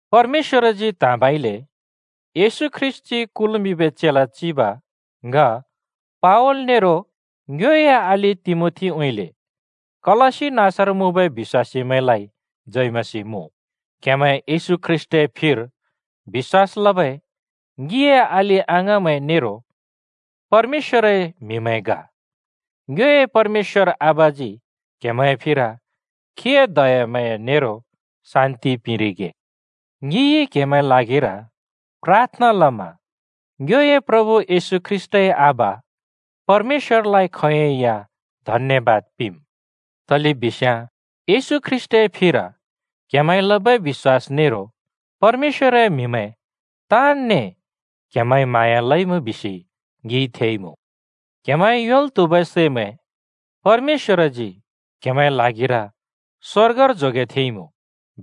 परमेश्‍वरजी त्हाँबइले येशू ख्रीष्‍टजी कुल्मिंबै चेला चिब ङ पावल नेरो ङ्योए अलि तिमोथीउँइँले, कलस्‍सी नाँसर मुँबै बिश्‍वासीमैंलाइ जय मसीह मुँ। क्हेमैं येशू ख्रीष्‍टए फिर बिश्‍वास लबै ङिए अलि-अङाँमैं नेरो परमेश्‍वरए म्‍हिमैं ग। ङ्योए परमेश्‍वर आबाजी क्‍हेमैंए फिर खीए दयाम्हाँया नेरो शान्ति पिंरिगे। ङिइ क्‍हेमैंए ल्हागिर प्राथना लमा ङ्योए प्रभु येशू ख्रीष्‍टए आबा परमेश्‍वरलाइ खोंयोंइ या धन्‍यबाद पिंम्। तलेबिस्याँ येशू ख्रीष्‍टए फिर्र क्हेमैंइ लबै बिश्‍वास नेरो परमेश्‍वरए म्‍हिमैं ताँनने क्‍हेमैंइ म्हाँया लइमुँ बिसि ङिइ थेइमुँ। क्हेमैंइ योंल् त्हुबै सैमैं परमेश्‍वरजी क्हेमैंए ल्हागिर स्वर्गर जोगेथेंइमुँ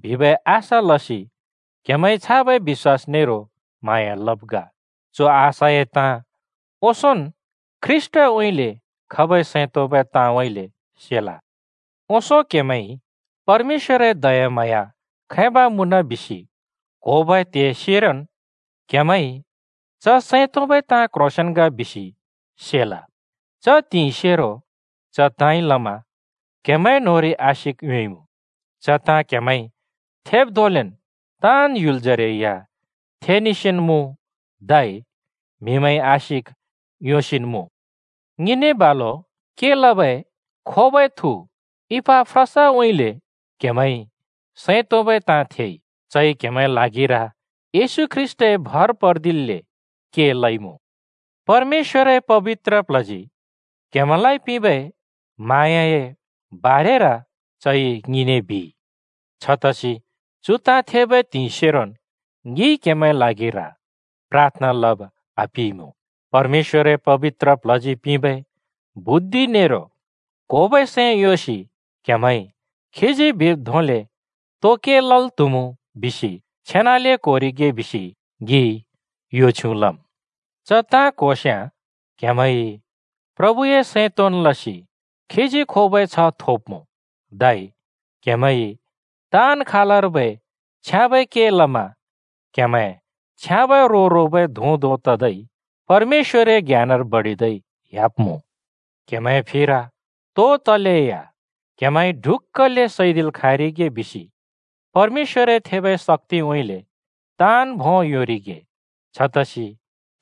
बिबै आशा लसि क्हेमैंइ छाबै बिश्‍वास नेरो म्हाँया लब् ग। चु आशाए ताँ ओंसोंन् ख्रीष्‍टउँइँले खबै सैं तोंबै ताँउँइँले सेल। ओंसों क्‍हेमैंइ परमेश्‍वरए दयाम्हाँया खैब मुँन बिसि क्‍होबै त्हिंइ सेरोन् क्‍हेमैंइ च सैं तोंबै ताँ क्ह्रोंसेंन् ग बिसि सेल। च त्हिंइ सेरो च ताँइ लमा क्‍हेमैं न्‍होंरि आशिक योंइमुँ। च ताँ क्‍हेमैंइ थेब् धोंलेन् ताँन् ह्‍युल जरे या थेनेसिन् मुँ धै म्हिमैंइ आशिक योंसिन् मुँ। ङिने बालु के लबै खोबै थु इपाफ्रासउँइँले क्हेमैंइ सैं तोंबै ताँ थेइ। चइ क्हेमैंए ल्हागिर येशू ख्रीष्‍टए भर पर्दिल्‍ले के लइमुँ। परमेश्‍वरए पबित्र प्ल्हजी क्‍हेमैंलाइ पिंबै म्हाँयाए बारेर चइ ङिने बिइ। छतसि च ताँ थेबै त्हिंइ सेरोन् ङिइ क्हेमैंए ल्हागिर प्राथना लब आपिइमुँ। परमेश्‍वरए पबित्र प्ल्हजी पिंबै बुद्धि नेरो क्‍होबै सैं योंसि क्हेमैंइ खीजी बिब् धोंले तो के लल् त्‍हुम् बिसि छेनाले क्‍होरिगे बिसि ङिइ यो छ्युँ लम्। च क्होस्याँ क्‍हेमैंइ प्रभुए सैं तोंन् लसि खीजी खोबै छ्ह थोब्मुँ, धै क्‍हेमैंइ ताँन् खालर्बै छ्याँबै के लमा क्‍हेमैं छ्याँबै रो रोबै धुँ धों ततै परमेश्‍वरए ज्ञानर बडिदै ह्‍याब्मुँ। क्‍हेमैंए फिर तो तलेया क्हेमैंइ ढुक्‍कले सैदिल् खाँरिगे बिसि परमेश्‍वरए थेबै शक्‍तिउँइँले ताँन् भों योंरिगे। छतसि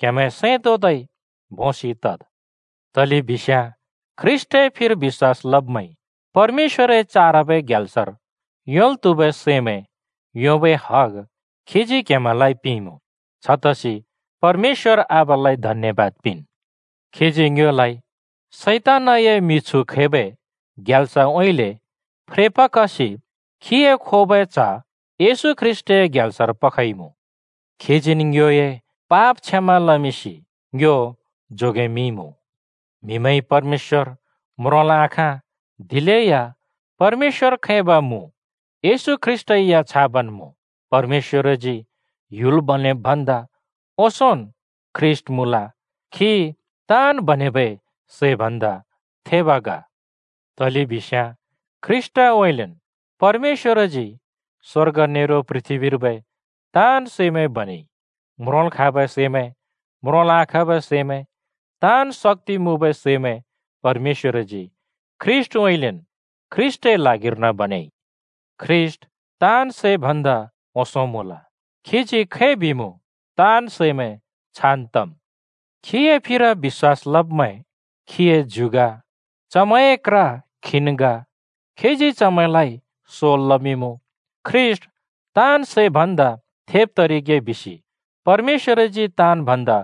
क्हेमैं सैं तोंदै भोंसि तद्। तलेबिस्याँ ख्रीष्‍टए फिर बिश्‍वास लब्मैंइ परमेश्‍वरए चारबै ग्यालसर योंल् त्हुबै सैमैं योंबै हग खीजी क्हेमैंलाइ पिंइमुँ। छतसि परमेश्‍वर आबालाइ धन्‍यबाद पिंन्। खीजी ङ्योलाइ शैतानए मिछु खैबै ग्याल्सउँइँले फ्रेपखसि खीए खोबै च्‍ह येशू ख्रीष्‍टए ग्याल्सर पखइमुँ। खीजीन् ङ्योए पाप क्षमा लमिंसि ङ्यो जोगेमिंइमुँ। म्‍हिमैंइ परमेश्‍वर म्रोंल् आखाँ, दिलेया परमेश्‍वर खैब मुँ, येशू ख्रीष्‍टै या छाबन् मुँ। परमेश्‍वरजी ह्‍युल बनेब् भन्दा ओंसोंन् ख्रीष्‍ट मुँल, खी ताँन् बनेबै सै भन्‍दा थेब ग। तलेबिस्याँ ख्रीष्‍टउँइँलेन् परमेश्‍वरजी स्‍वर्ग नेरो पृथ्‍बीर्बै ताँन् सैमैं बनेइ। म्रोंल् खाँबै सैमैं, म्रोंल् आखाँबै सैमैं, ताँन् शक्‍ति मुँबै सैमैं परमेश्‍वरजी ख्रीष्‍टउँइँलेन् ख्रीष्‍टए ल्हागिर्न बनेइ। ख्रीष्‍ट ताँन् सै भन्दा ओंसों मुँल, खीजी खै बिमुँ ताँन् सैमैं छान् तम्। खीए फिर बिश्‍वास लब्मैं खीए ज्यु ग, चमैंए क्र खीन् ग। खीजी चमैंलाइ सोल् लमिंमुँ। ख्रीष्‍ट ताँन् सै भन्दा थेब तरिगे बिसि परमेश्‍वरजी ताँन् भन्दा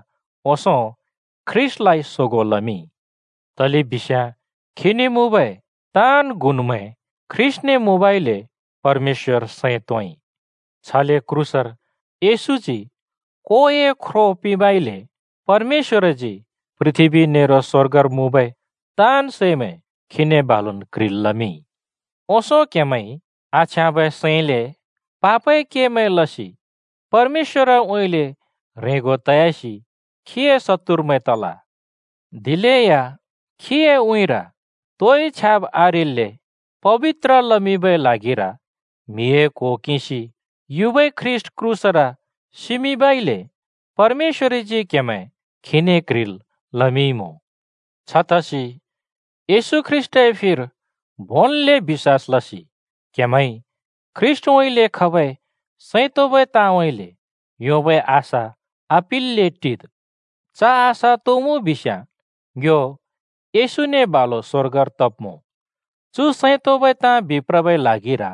ओंसों ख्रीष्‍टलाइ सोगों लमिंइ। तलेबिस्याँ खीने मुँबै ताँन् गुनमैं ख्रीष्‍टने मुँबइले परमेश्‍वर सैं तोंइ। छले क्रूसर येशूजी कोए ख्रो पिंबइले परमेश्‍वरजी पृथ्‍बी नेरो स्‍वर्गर मुँबै ताँन् सैमैं खीने बालुन् क्ह्रिल् लमिंइ। ओंसों क्‍हेमैंइ आछ्याँबै सैंले पापए केमैं लसि परमेश्‍वरउँइँले ह्रेंगो तयासि खीए शत्तुरमैं तल। दिलेया खीए उँइँर तोइ छ्याब् आरेल्‍ले पबित्र लमिंबै ल्हागिर म्हिए क्हो किंसि युबै ख्रीष्‍ट क्रूसर सिमिंबइले परमेश्‍वरजी क्‍हेमैं खीने क्ह्रिल् लमिंइमुँ। छतसि येशू ख्रीष्‍टए फिर भोंन्ले बिश्‍वास लसि क्‍हेमैंइ ख्रीष्‍टउँइँले खबै सैं तोंबै ताँउँइँले योंबै आशा आपिल्‍ले टिद्। (च आशा तो मुँ बिस्याँ ङ्यो येशूने बालु स्‍वर्गर तब्मुँ।) चु सैं तोंबै ताँ बिप्रबै ल्हागिर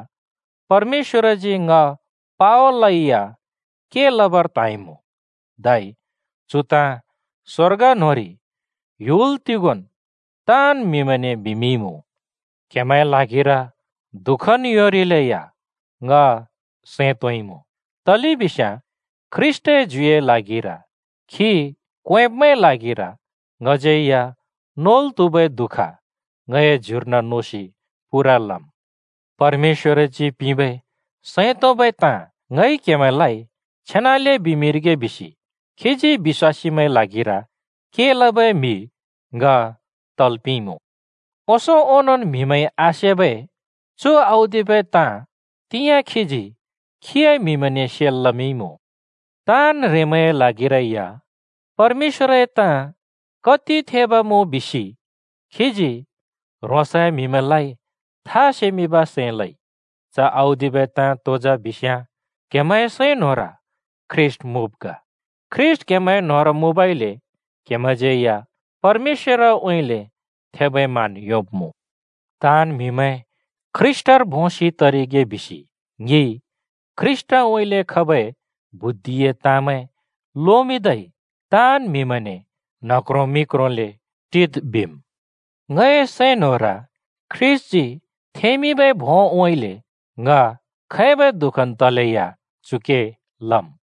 परमेश्‍वरजी ङ पावलइ या के लबर त्हाँइमुँ, धै चु ताँ स्वर्ग न्होंरि ह्‍युल तिगोंन् ताँन् म्‍हिमैंने बिमिंइमुँ। क्हेमैंए ल्हागिर दुःखन् योंरिलेया ङ सैं तोंइमुँ, तलेबिस्याँ ख्रीष्‍टए ज्युए ल्हागिर, खी क्वेंब्मैंए ल्हागिर ङज्यै या नोल् त्हुबै दुःख ङ‍ए ज्युर्न नोसि पूरा लम्। परमेश्‍वरजी पिंबै सैं तोंबै ताँ ङइ क्हेमैंलाइ छेनाले बिमिंरिगे बिसि खीजी बिश्‍वासीमैंए ल्हागिर के लबै म्हि ङ तल् पिंइमुँ। ओंसों ओंनोंन् म्‍हिमैंइ आसेबै चु औदिबै ताँ तिंयाँ खीजी खीए म्‍हिमैंने सेल् लमिंइमुँ। ताँन् ह्रेंमैंए ल्हागिरै या परमेश्‍वरए ताँ कति थेब मुँ बिसि खीजी ह्रोंसए म्हिमैंलाइ था सेमिंब सैं लइ। च औदिबै ताँ तो जा बिस्याँ क्‍हेमैंए सैं न्‍होंर ख्रीष्‍ट मुँब् ग। ख्रीष्‍ट क्‍हेमैं न्‍होंर मुँबइले क्‍हेमैंज्यै या परमेश्‍वरउँइँले थेबै मान योंब्‍मुँ। ताँन् म्हिमैं ख्रीष्‍टर भोंसि तरिगे बिसि ङिइ ख्रीष्‍टउँइँले खबै बुद्धिए ताँमैं लोमिंदै ताँन् म्हिमैंने न्ह क्रों मि क्रोंले टिद् बिम्। ङए सैं न्होंर ख्रीष्‍टजी थेंमिंबै भोंउँइँले ङ खैबै दुःखन् तलेया चु के लम्।